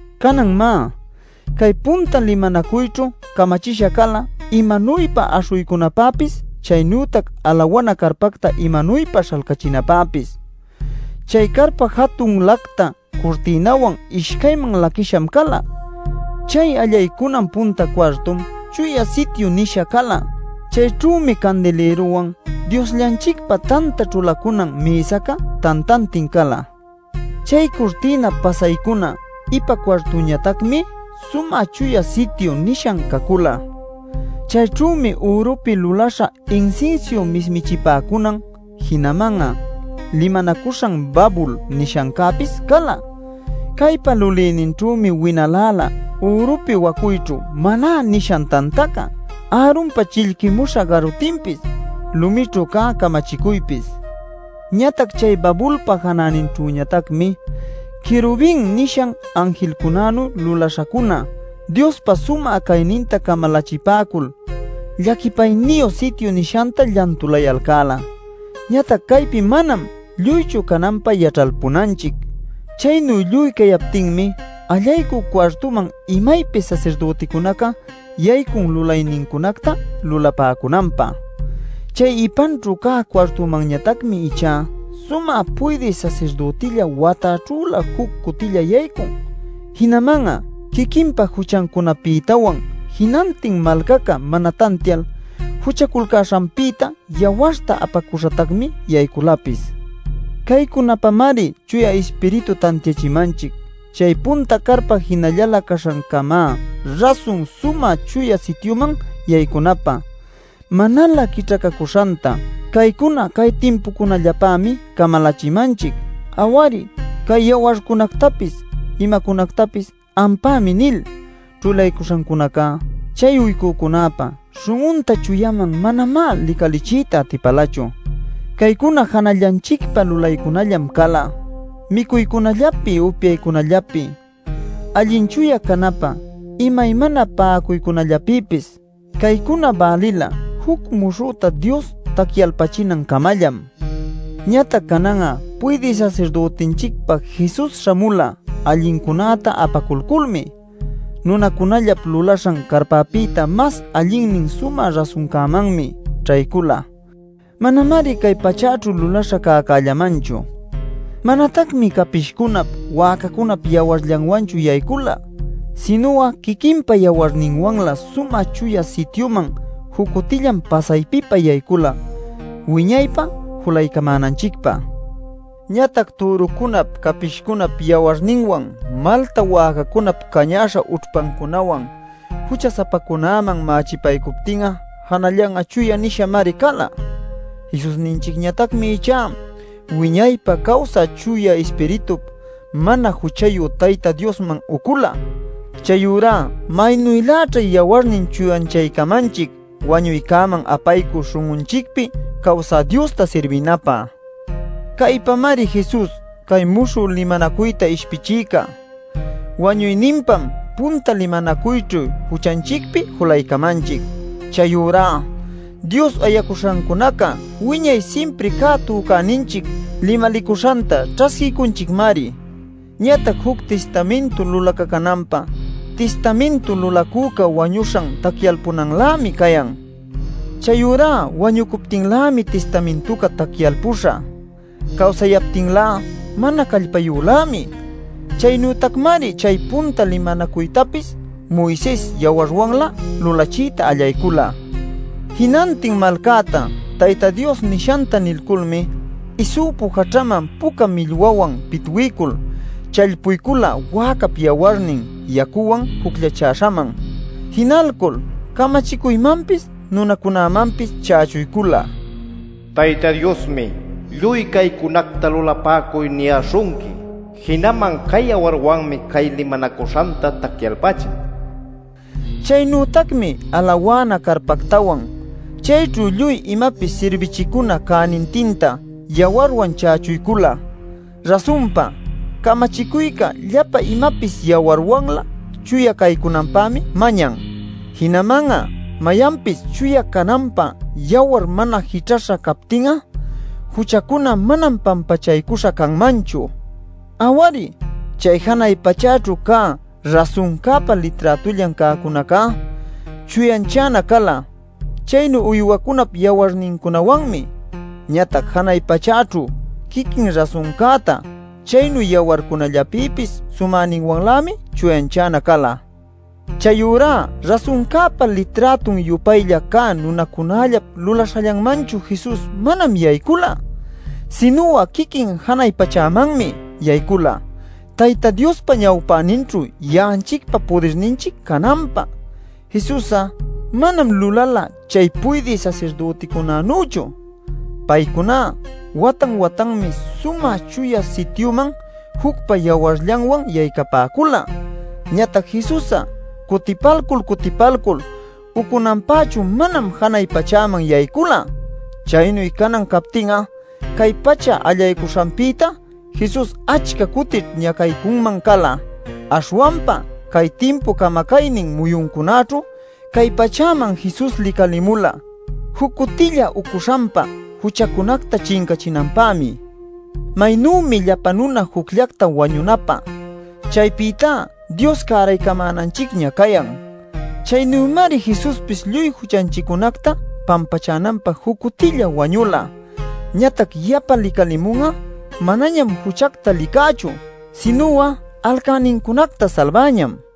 Canan má, cay punta limanacuyćhu camachisha cala imanuypa aśhuycunapäpis chaynütac alawana carpacta imanuypa śhalcachinapäpis. Chay carpa jatun lacta curtïnawan ishcayman laquïsham cala. Chay allaycunan punta cuartum “Chuya Sityu” nisha cala. Chayćhümi candilïruwan, Diosllanchicpa tanta ćhulacunan mïsaca tantantin cala. Chay curtïnap pasaycuna ipa cuartuñatacmi “Sumä Chuya Sityu” nisha cacula. Chayćhümi ürupi luläśha insinsiu mismichipäcunan jinaman'a “limanacuśhan babul” nishancäpis cala. Caypa lulïninćhümi winaläla ürupi wacuyćhu Maná nishan tantaca, Aaronpa chillquïmuśha garutinpis, lumićhu cä camachicuypis. Ñatac chay babulpa janäninćhüñatacmi “querubin” nishan anjilcunänu luläśhacuna Diospa sumä cayninta camalachipäcul llaquipayniyu sityu nishanta llantulayalcäla. Ñatac caypi manam lluychu cananpä yaćhalpunanchic. Chaynu lluy cayaptinmi, allaycü cuartuman imaypis sasirdüticunaca yaycun lulaynincunacta lulapäcunanpä. Chay ipanćhu cä cuartumanñatacmi ichá sumä puydï sasirdütilla watäćhülä juc cutilla yaycun. Jinaman'a quiquinpa juchancunapïtawan jinantin malcaca mana tantial juchaculcäśhanpïta yawarta apacuśhatacmi yayculapis. Caycunapamari Chuya Ispiritu tantiachimanchic chay punta carpa jinallalä caśhancamá rasun Sumä Chuya Sityuman yaycunapä manalä quićhacacuśhanta. Caycuna cay timpucunallapämi camalachimanchic. Aw-ari, cay yawarcunactapis imacunactapis “ampämi nil” ćhulaycuśhancunaca, chay uycücunäpa śhun'unta chuyaman manamá licalichiyta atipälachu. Caycuna janallanchicpa lulaycunallam cala: micuycunallapi, upyaycunallapi, allin chuya canapä imaymana pa'acuycunallapïpis. Caycuna bälila juc muśhüta Dios tacyalpachinancamallam. Ñatac canan'a puydï sasirdütinchicpa Jesus śhamula allincunäta apaculculmi. Nunacunallap lulaśhan carpapïta mas allinnin sumä rasuncämanmi ćhaycula. Manamari cay pachäćhu lulaśha cäcällamanchu. Manatacmi capishcunap, wäcacunap yawarllanwanchu yaycula. Sinu'a quiquinpa yawarninwanlä Sumä Chuya Sityuman juc cutillam pasaypipa yaycula wiñaypä julaycamänanchicpä. Ñatac türucunap capishcunap yawarninwan, malta wäcacunap cañäśha ućhpancunawan jucha-sapacunäman mächipaycuptin'a janallan'a chuya nishamari cala. Jesusninchicñatacmi ichá wiñaypä cawsä Chuya Ispiritup mana juchayu Tayta Diosman ucula. Chayurá ¡maynüläćha yawarnin chuyanchaycamanchic wañuycäman apaycü śhun'unchicpi cawsä Diosta sirbinapä! Caypamari Jesus cay muśhü limanacuyta ishpichïca. Wañuyninpam punta limanacuyćhu juchanchicpi julaycamanchic. Chayurá Dios ayacuśhancunaca wiñay simpri cä tücäninchic limalicuśhanta ćhasquiycunchicmari. Ñatac juc tistamintu lulacacunanpä tistamintu lulacüca wañuśhan tacyalpunanlämi cayan. Chayurá wañucuptinlämi tistamintuca tacyalpuśha; cawsayaptinlá mana callpayülämi. Chaynütacmari chay punta limanacuytapis Moises yawarwanlä lulachiyta allaycula. Jinantin malcäta Tayta Dios nishanta nilculmi isupu jaćhaman puca millwawan pitwiycul challpuycula wäcap yawarnin yacuwan jucllachäśhaman. Jinalcul camachicuymanpis nunacunämanpis chächuycula: “Tayta Diosmi ‘Lluy caycunacta lulapäcuy’ niyäśhunqui. Jinaman cay yawarwanmi cay limanacuśhanta tacyalpachin” nishtin. Chaynütacmi alawana carpactawan, chayćhu lluy imapis sirbichicuna cänintinta yawarwan chächuycula. Rasunpa, camachicuyca llapa imapis yawarwanlä chuya caycunanpämi mañan. Jinaman'a mayanpis chuya cananpä yawar mana jićhaśha captin'a juchacuna manam pampachaycuśha canmanchu. Aw-ari, chay janay pachäćhu cä rasuncäpa liträtullan cäcunacá chuyanchana cala chaynu uywacunap yawarnincunawanmi. Ñatac janay pachäćhu quiquin rasuncätá chaynu yawarcunallapïpis sumäninwanlämi chuyanchana cala. Chayurá rasuncäpa liträtun-yupaylla cä nunacunallap lulaśhallanmanchu Jesus manam yaycula. Sinu'a quiquin janay pachämanmi yaycula Tayta Diospa ñawpäninćhu ya'anchicpa pudirninchic cananpä. Jesus'a manam lulala chay puydï sasirdüticunanüchu. Paycuná watan-watanmi Sumä Chuya Sityuman jucpa yawarllanwan yaycapäcula. Ñatac Jesus'a cutipalcul cutipalcul ucunanpächu manam janay pachäman yaycula. Chaynu canan captin'a cay pacha allaycuśhanpïtá Jesus achca cutićh ñacaycunman cala. Aśhwanpa cay timpup camacaynin muyuncunäćhu cay pachäman Jesus licalimula juc cutilla ucuśhanpa juchacunacta chincachinanpämi. Maynümi llapa nuna jucllacta wañunapä chaypïtá Dios cäraycamänanchicña cayan. Chaynümari Jesuspis lluy juchanchiccunacta pampachänanpä juc cutilla wañula. Ñatac yapa licalimun'a, manañam juchacta licächu, sinu'a alcänincunacta salbäñam.